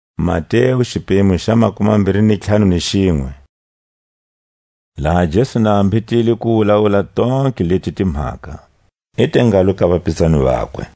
A khungo go daya Jesu. Laha Jesu na a mbhetile ku wulawula tontlhe leti timhaka, i te ngalo ka vapizani vakwe: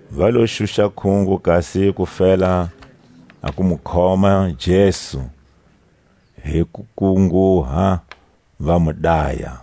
Va lo xuxa kungo kasi va fela ku khoma Jesu hi kukunguha, va mu daya;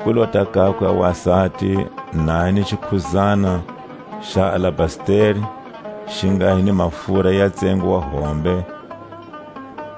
ku lota kakwe a wasati na a hi ni xikhudzana xa alabasteri xi nga hi ni mafura ya tsengo wa hombe,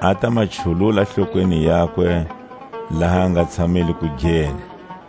a ta ma chulula hlokweni yakwe laha a nga tshamile kugeni.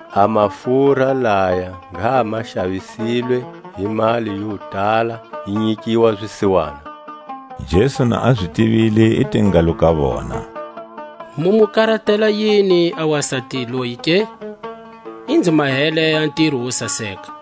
A mafura laya ngha ma xavisilwe hi mali yo tala, yi nyikiwa zisiwana. Jesu na a zi tivile i te ngalo ka vona: Mu mu karatela yini a wasati loyi ke? I nzi mahele a ntiro wo saseka.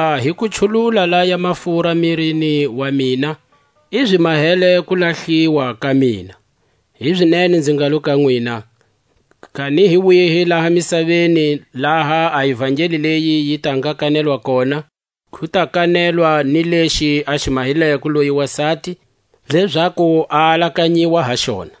Hakuva hi ku chulula laya mafura mirini wa mina, i zi mahele kulahliwa ka mina. Hizinene nzi ngalo ka nwina: Kani hi kwihi laha misaveni laha a ivangeli leyi yi ta nga kanetwa kona, ku ta kanetwa ni lexi a xi mahileko loyi wasati, lezaku a alakanyiwa ha xona.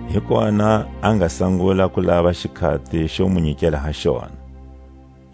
Hi kona a nga sangula ku lava xikhati xo mu nyikela ha xona. A Pasika.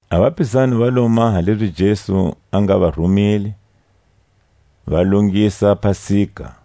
A vapizani va lo maha lezi Jesu a nga va rumile, va longisa pasika.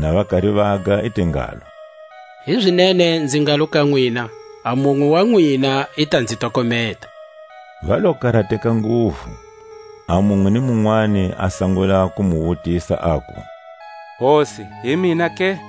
Na va kari vaga i te ngalo: Hizinene nzi ngalo ka nwina: A munwe wa nwina i ta nzi tokometa. Va lo karateka nguvu, a munwe ni munwani a sangula ku mu wutisa, aku: Hosi, hi mina ke?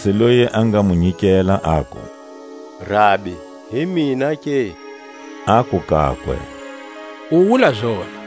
Judasi loyi a nga mu nyikela, aku: Rabi hi mina ke? Aku kakwe: U wula zona.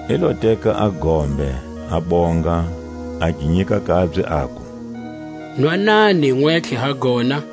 I lo teka a gombe, a bonga, a gi nyika kabye, aku: Nwanani nwentlhe ha gona;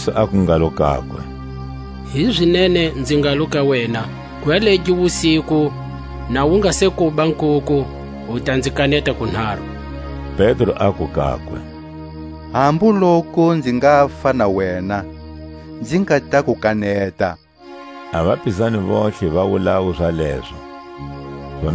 Jesu aku ngalo kakwe: Hizinene nzi ngalo ka wena: Gwalegi wusiku, na wu nga se kuba nkuku, u ta nzi kaneta kunharu. Pedro aku kakwe: Hambu loku nzi ngafa na wena, nzi nga ta ku kaneta. A vapizani vontlhe va wulawu zalezo. Getsemane.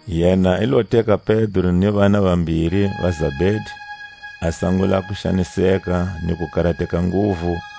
Yena i lo teka Pedro ni vana vambiri va Zabedi, a sangula ku xaniseka ni ku karateka nguvu.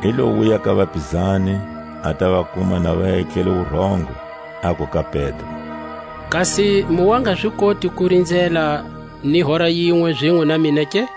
I lo wuya ka vapizani, a ta va kuma na va etlele wurongo, aku ka Pedro: Kasi mu wa nga zi koti ku rinzela ni hora yinwe zinwe na mina ke?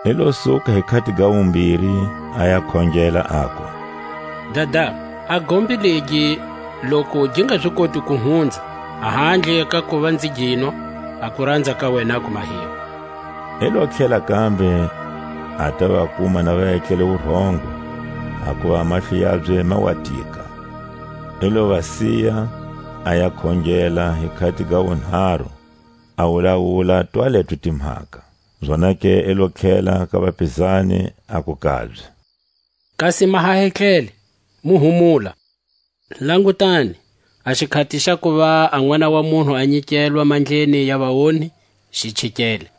I lo suka hi khati ga wumbiri, a ya khongela, aku: Dada, a gombe legi loku gi nga zi koti ku hunza, a handle ka kuva nzi ginwa, a kuranza ka wena a ku mahiwe. I lo tlhela kambe a ta va kuma na va etlele wurongo, hakuva a mahlo yabye ma wa tika. I lo va siya; a ya khongela hi khati ga wunharu, a wulawula twaleto timhaka. Zonake i lo tlhela ka vapizani, aku kabye: Kasi ma ha etlele, mu humula! Langutani, a xikhati xa kuva a Nʼwana wa munhu a nyikelwa mandleni ya vaonhi xi chikele.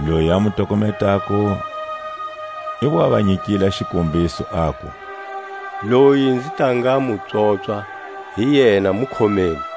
Loyi a mu tokometako i wa va nyikile a xikombiso, aku: Loyi nzi ta nga mu pswopswa, hi yena; mu khomeni.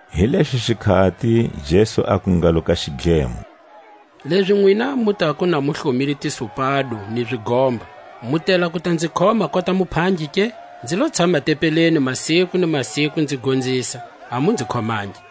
Hi lexo xikhati Jesu aku ngalo ka xidlemo: Lezi nwina mu tako na mu hlomile tisupado ni zigomba, mu tela ku ta nzi khoma kota muphangi ke? Nzi lo tshama tempeleni masiku ni masiku nzi gonzisa, a mu nzi khomangi.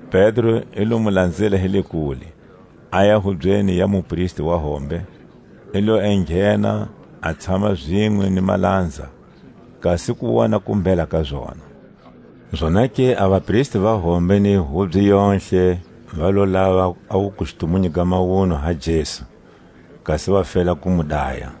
Pedro i lo mu lanzela hi le kule, aya hubyeni ya mupristi wa hombe; i lo enghena a tshama zinwe ni malanza, kasi ku wona kumbhela ka zona. Zonake a vapristi va hombe ni hubye yontlhe va lo lava a wukustumunyu ga mawunwa ha Jesu, kasi va fela ku mu daya;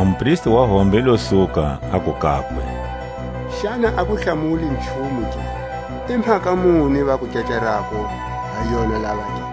A mupristi wa hombe i lo suka, aku kakwe: Xana a ku hlamuli nchumu ke? I mhaka muni va ku kecarako ha yona lava ke?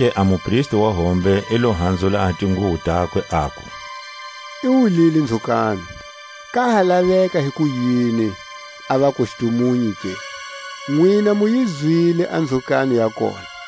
Zonake a mupristi wa hombe i lo hanzula a tinguwo takwe, aku: I wulile nzhukano! Ka ha laveka hikuyini a vakustumunyu ke? Nwina mu yi zwile a nzhukano ya kona.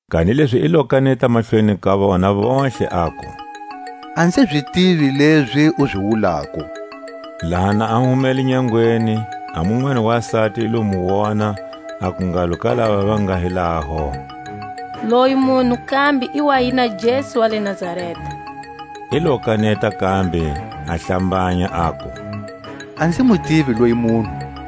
Kanilezi i lo kaneta mahlweni ka vona vontlhe, aku: A nzi zi tivi lezi u zi wulako. Laha na a humele nyangweni, a munwani wasati i lo mu wona, aku ngalo ka lava va nga hi laho: Loyi munhu kambe i wa hi na Jesu wa le Nazareta. I lo kaneta kambe a hlambanya, aku: A nzi mu tivi loyi munhu.